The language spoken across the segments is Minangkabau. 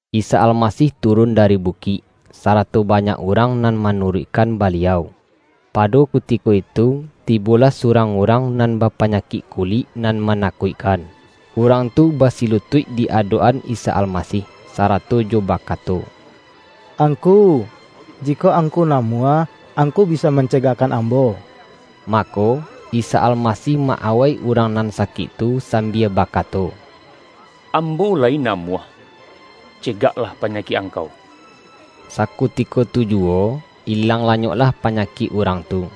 Isa Almasih turun dari bukik, sarato banyak urang nan manuruik-kan Baliau. Pado kutiko itu tibolah su-rang urang nan bapanyakik kulik nan manakuikkan. Urang tu basilutuik di adok-an Isa Almasih, sarato jo bakato,”Angku, jikok Angku namuah, Angku bisa mancegakkan ambo.” Mako, Isa Almasih ma-awai urang nan sakik tu sambia bakato,”Ambo la-yi namuah. Cegaklah panyakik ang-kau!” Sakutiko tu juwo, ilang lanyok-lah panyakik urang tu.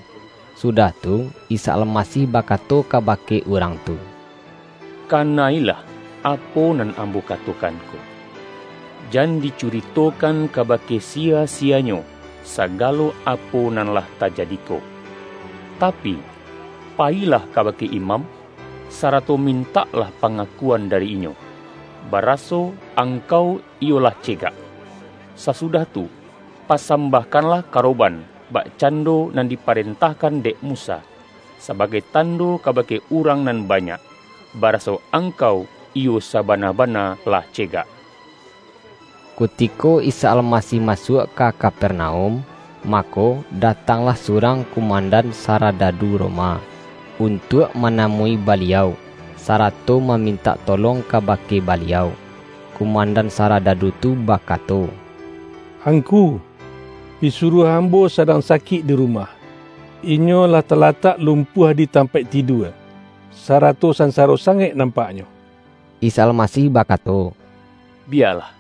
Sudah tu, Isa Almasih bakato kabake urang tu,”Ka-na-ilah apo nan Ambo katokan ko! Jan dicuritokan kabake siya-siyanyo, sa-galo apo nan lah tajadi ko. Tapi, pa-yilah kabake imam, sarato mintaklah pangakuan dari inyo, baraso, angkau iyo lah cegak. Sasudah tu pasambah-kanlah karoban, bakcando nan dipa-rentahkan dek Musa, sabagai tando kabake urang nan banyak, baraso ang-kau iyo sabana-bana lah cegak!” Kutiko Isa Almasih masuak ka Ka-pernaum, mako, datanglah surang kumandan saradadu Roma, untuak ma-namui Baliau, sarato mamintak tolong kabake Baliau. Kumandan saradadu tu bakato,”Angku, pisuruah ambo sa-dang sakik di rumah. Inyo lah talatak lumpuah di tampaik tidua, sarato san-saro sangaik nampaknyo.” Isa Almasih bakato,”Biyalah,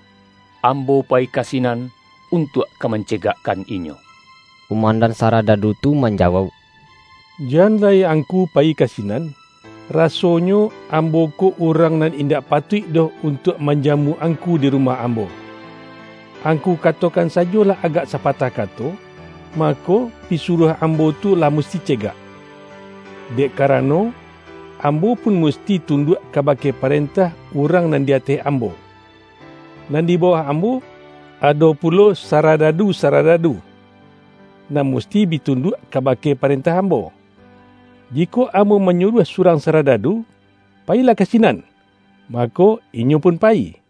Ambo payi ka sinan untuak ka mancegak-kan inyo.” Kumandan saradadu tu manjawauk,”Jan lai Angku payi kasinan. Rasonyo, ambo ko urang nan indak patuik doh untuak manjamu Angku di rumah am-bo. Angku katokan sajolah agak sa-patah kato. Mako, pisuruah ambo tu lah musti cegak. Dek karano, ambo pun musti tunduak kabake parentah urang nan di ateh ambo. Nan di ba-wah ambo, ado pulo saradadu-sarada-du, nan musti bi tunduak kabake pa-rentah ambo. Jikok ambo manyuruah surang saradadu, ’Payilah ka sinan!’ mako, inyo pun payi.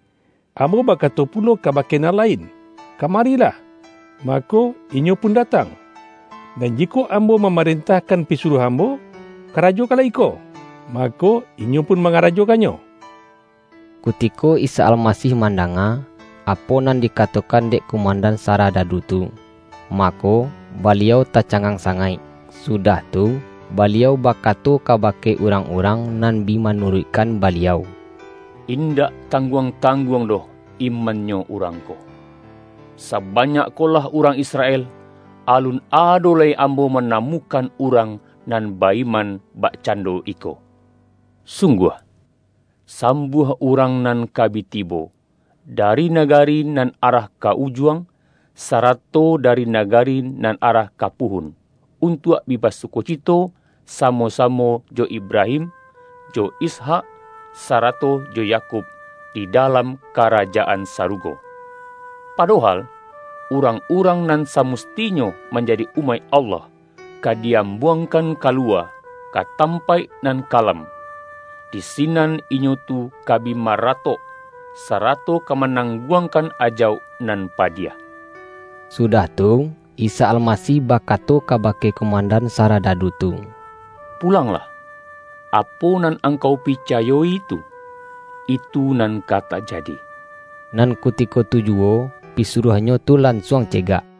Ambo bakato pu-lo kabake nan lain, ’Kamarilah!’ ma-ko, inyo pun datang; nan jikok ambo mamarentahkan pisuruah ambo, ’Ka-rajokanlah iko!’ mako, inyo pun ma-ngarajokannyo.” Kutiko Isa Almasih mandanga, apo nan dikatokan dek kumandan sarada-du tu, mako, Baliau tacangang sangaik Sudah tu, Baliau bakato kabake urang-urang nan bi manuruikkan Baliau,”In-dak tangguang-tangguang doh iman-nyo urang ko. Sabanyak ko lah urang Israel, alun ado lai Ambo manamu-kan urang nan ba-iman bakcando iko! Sungguah! Sambuah urang nan ka bi tibo, dari nagari nan arah ka Ujuang, sarato dari nagari nan arah ka Puhun, untuak bi basukocito samo-samo jo Ibrahim, jo Ishak, sarato jo Yakub di dalam Karajaan Sarugo. Padohal, urang-urang nan samus-tinyo manjadi umaik Allah, ka di-am-buangkan kaluwa ka tampaik nan ka-lam. Di sinan inyo tu ka bi maratok, sarato ka manangguangkan ajauk nan padiah.” Sudah tu, Isa Almasih ba-kato kabake kumandan saradadu tu,”Pulanglah, apo nan angkau picayo-i tu, itu nan ka tajadi.” Nan kutiko tu juwo, pisuruahnyo tu lansuang cegak.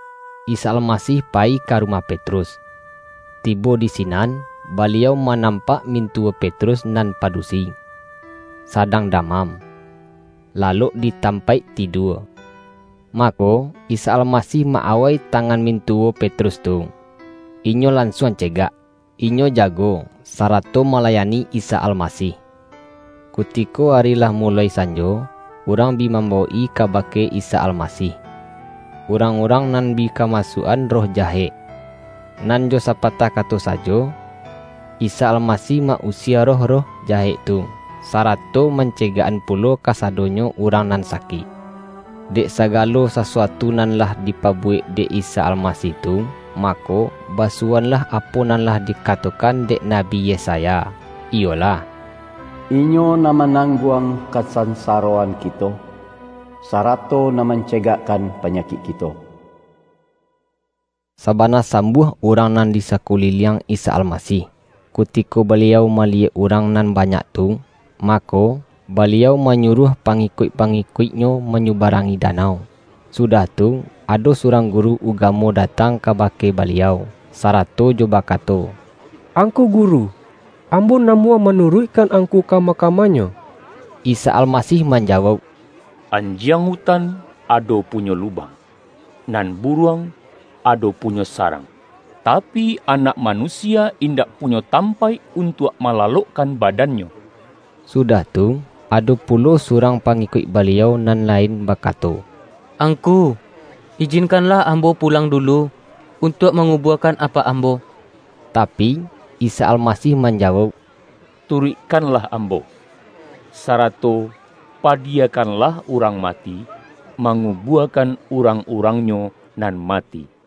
Isa Almasih payi ka rumah Petrus. Tibo di sinan, Baliau manampak min-tuwo Petrus nan padusi, sadang da-mam, lalok di tampaik tidua. Mako, Isa Almasih ma-awai tangan mintuwo Petrus tu, inyo lansuang cegak. Inyo jago, sarato malayani Isa Almasih. Kutiko ari lah muloi sanjo, urang bi mambawok-i kabake Isa Almasih, urang-urang nan bi kamasuak-an roh jahek. Nan jo sapatah kato sajo, Isa Almasih ma-usie roh-roh jahek tu, sara-to mancegakkan pulo kasadonyo urang nan sakik. Dek sagalo sasuatu nan lah dipabuwek dek Isa Almasih tu, mako, basuwoanlah apo nan lah dikatokan dek Nabi Yesaya, iyolah,”Inyo nan ma-nangguang kasansaroan kito, sarato nan mancegakkan panyakik kito.” Sabana sambuah urang nan di sa-kuliliang Isa Almasih. Kutiko Baliau maliyek urang nan banyak tu, mako, Baliau manyuruah pangikuik-pangi-kuik-Nyo manyubarangi danau. Sudah tu, ado surang guru ugamo datang ka-bake Baliau, sarato jo bakato,”Ang-ku Guru, ambo namuah manuruikkan Angku kama-kamanyo!” Isa Almasih manjawauk,”Anjiang utan ado punyo lubang, nan buruang ado punyo sarang, tapi, Anak Manu-sia indak punyo tampaik untuak ma-lalokkan badan-Nyo.” Sudah tu, ado pulo surang pangi-kuik Baliau nan lain bakato,”Angku, ijinkanlah ambo pulang dulu, untuak mangubuakan apak ambo.” Tapi, Isa Almasih manjawauk,”Tu-ruikkanlah Ambo, sarato padiyakan-lah urang mati, mangubuakan urang-urangnyo nan mati.”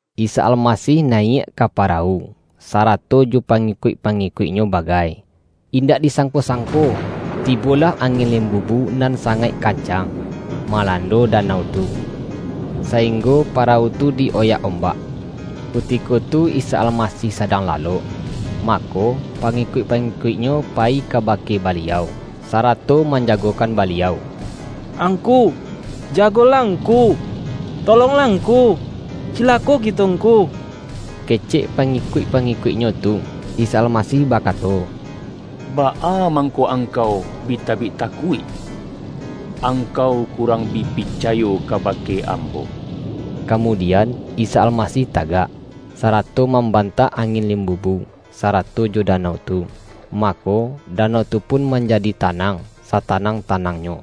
Isa Almasih nayiak ka parawu, sa-rato jo pangikuik-pangikuik-Nyo ba-gai. Indak disangko-sangko, tibolah angin limbubu nan sangaik kancang, malando danau tu, sainggo parawu tu di-oyak ombak. Kutiko tu Isa Almasih sadang lalok. Mako, pangikuik-pa-ngikuik-Nyo payi kabake Baliau, sa-rato manjagokan Baliau.”Angku, ja-golah Ngku! Tolonglah Ngku! Cilako kito Ngku!” kecek pangikuik-pangi-kuik-Nyo tu. Isa Almasih bakato,”Baa mangko angkau bi tabik takuik? Angkau ku-rang bi picayo kabake Ambo!” Kamu-dian, Isa Almasih tagak, sarato mam-bantak angin limbubu, sarato jo danau tu. Mako, danau tu pun manjadi ta-nang, satanang-tanangnyo.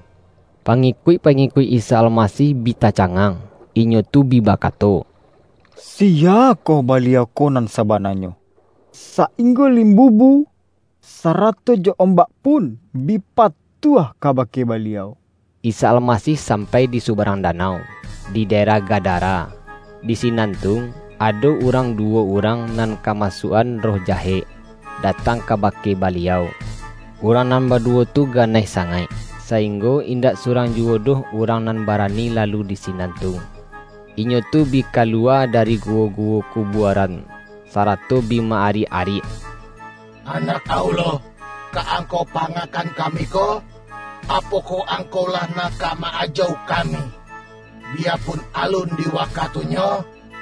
Pangikuik-pangikuik Isa Almasih bi tacangang. Inyo tu bi bakato,”Si-yakoh Baliau ko nan sabananyo, sa-inggo limbubu, sarato jo ombak pun bi patuah kabake Baliau!” Isa Almasih sampai di subarang danau, di daerah Gadara. Di sinan tu, ado urang duwo urang nan kamasuak-an roh jahek, datang kabake Baliau. Urang nan baduwo tu ganaih sangaik, sainggo indak surang juwo doh urang nan barani lalu di sinan tu. Inyo tu bi kaluwa dari guwo-guwo kubuaran, sarato bi ma-ariak-ariak,”Anak Allah, ka Angkau pangakan kami ko? Apokoh Angkau lah nak ka ma-ajauk kami, bi-yapun alun di wakatunyo?”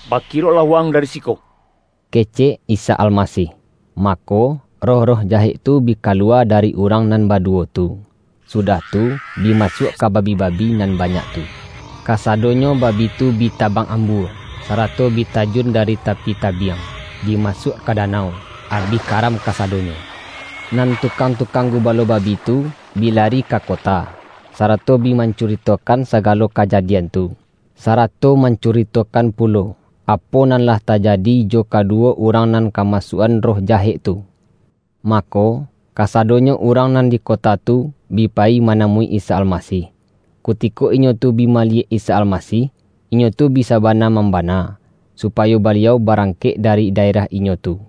”Bakiroklah wa-ang dari siko!” ke-cek Isa Almasih. Mako, roh-roh jahek tu bi kaluwa dari urang nan baduwo tu, sudah tu, bi masuak ka babi-babi nan banyak tu. Kasadonyo babi tu bi tabang ambua, sarato bi tajun dari ta-pi tabiang, bi masuak ka danau, abih karam kasadonyo. Nan tukang-tukang gubalo babi tu, bi lari ka kota, sarato bi mancuri-tokan sagalo kajadian tu, sarato man-curitokan pulo, apo nan lah tajadi jo kaduwo urang nan kamasuak-an roh jahek tu. Mako, kasadonyo urang nan di kota tu, bi payi manamui Isa Almasih. Kutiko inyo tu bi maliyek Isa Almasih, inyo tu bi sabana mam-bana, supayo Baliau barangkek dari daerah inyo tu.